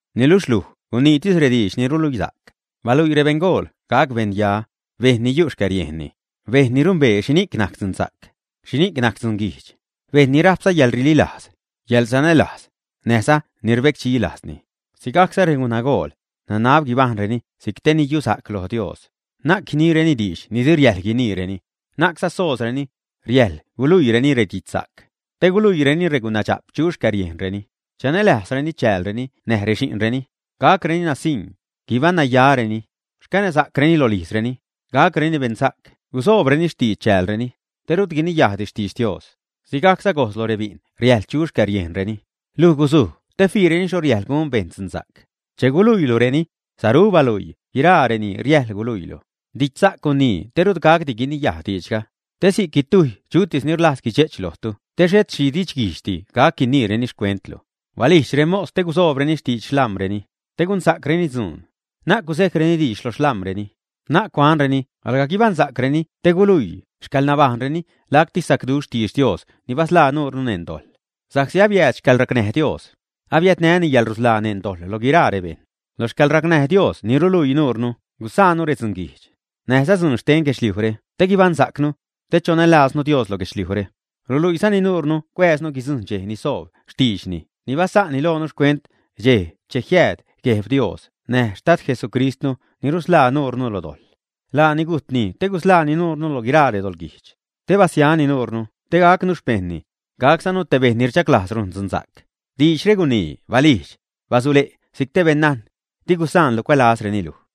Niluxh luj guniitis rediidx ni ruluisa'c. Baluii rebeṉgool gac beṉya, bejṉ ni yu' xcäriejnni, bejṉ ni rumbee xhini'c najc dzunsa'c, xhini'c najc dzunguijdx, bejṉ ni rajpza yäḻrililajz, yäḻsanälajz, näjza ni rbecdxi lajzni. Sigajcza, regunagool, nanab guibajṉreni si'c te ni yusa'c lo Dios, na'c guiniireni diidx ni di riäjḻ guiniireni, na'cza soozreni. Riäjḻ guluiireni redidxsa'c te guluiireni regunaa dxa'p chu xcäriejnreni, chanälajzreni chäälreni näj rexi'nreni. Gacreni nasiṉ, guibaṉnayareni, xcanäsa'creni rolijzreni, gacreni beṉsa'c gusoobreni xtidx chäälreni, te rut guiniyajdi xtidx Dios. Sigajcza gojz lo rebi'n riäjḻ chu xcäriejnreni. Luj guzuj te fiireni xho riäjḻ gun bejṉ dzunsa'c. Che guluiilureni, saru baluii guiraa reni riäjḻ guluiilu. Didxsa'c gunii te rut gacdi guiniyaj diidxga, te si'c guitujy chutis ni rlajz guidxe'ch lojtu te xhet xhi didxguijdxdi gac guiniireni xcuentlu. Balijdx remos te gusoobreni xtidx xlam̲reni, te gunsa'creni dzuun, na'c guzejcreni diidx lo rexlam̲reni. Na'c cuanreni alga guibaṉsa'creni te guluii xcäḻnabajṉreni lacti sacduxh xtidx Dios ni basḻaa nuurnu neṉ dojḻ. Sa'csi abiääd xcäḻracnäj Dios, abiädnäni yälrusḻaa neṉ dojḻ lo guiraa rebejṉ. La xcäḻracnäj Dios ni ruluii nuurnu gusa'nnu redzunguijdx, näjza dzuun xten guedxliujre te guibaṉsa'cnu, te chonälajznu Dios lo guedxliujre. Ruluiizani nuurnu cuääznu guidzujṉ dxej ni soob xtiidxni ni basa'nni loonu xcuent dxej che jiääd Gueb Dios näj Xtad Jesucristnu ni rusḻaa nuurnu lo dojḻ. Laani gujtni te gusḻaani nuurnu lo guiraa redoḻguijdx, te basiani nuurnu te gacnu xpejṉni, gaczanu te bejṉ ni rdxaglajz rujn dzunsa'c. Diidxre gunii, balijdx, basule' si'c te beṉnajn. Di gusaanlu cuälazreni luj.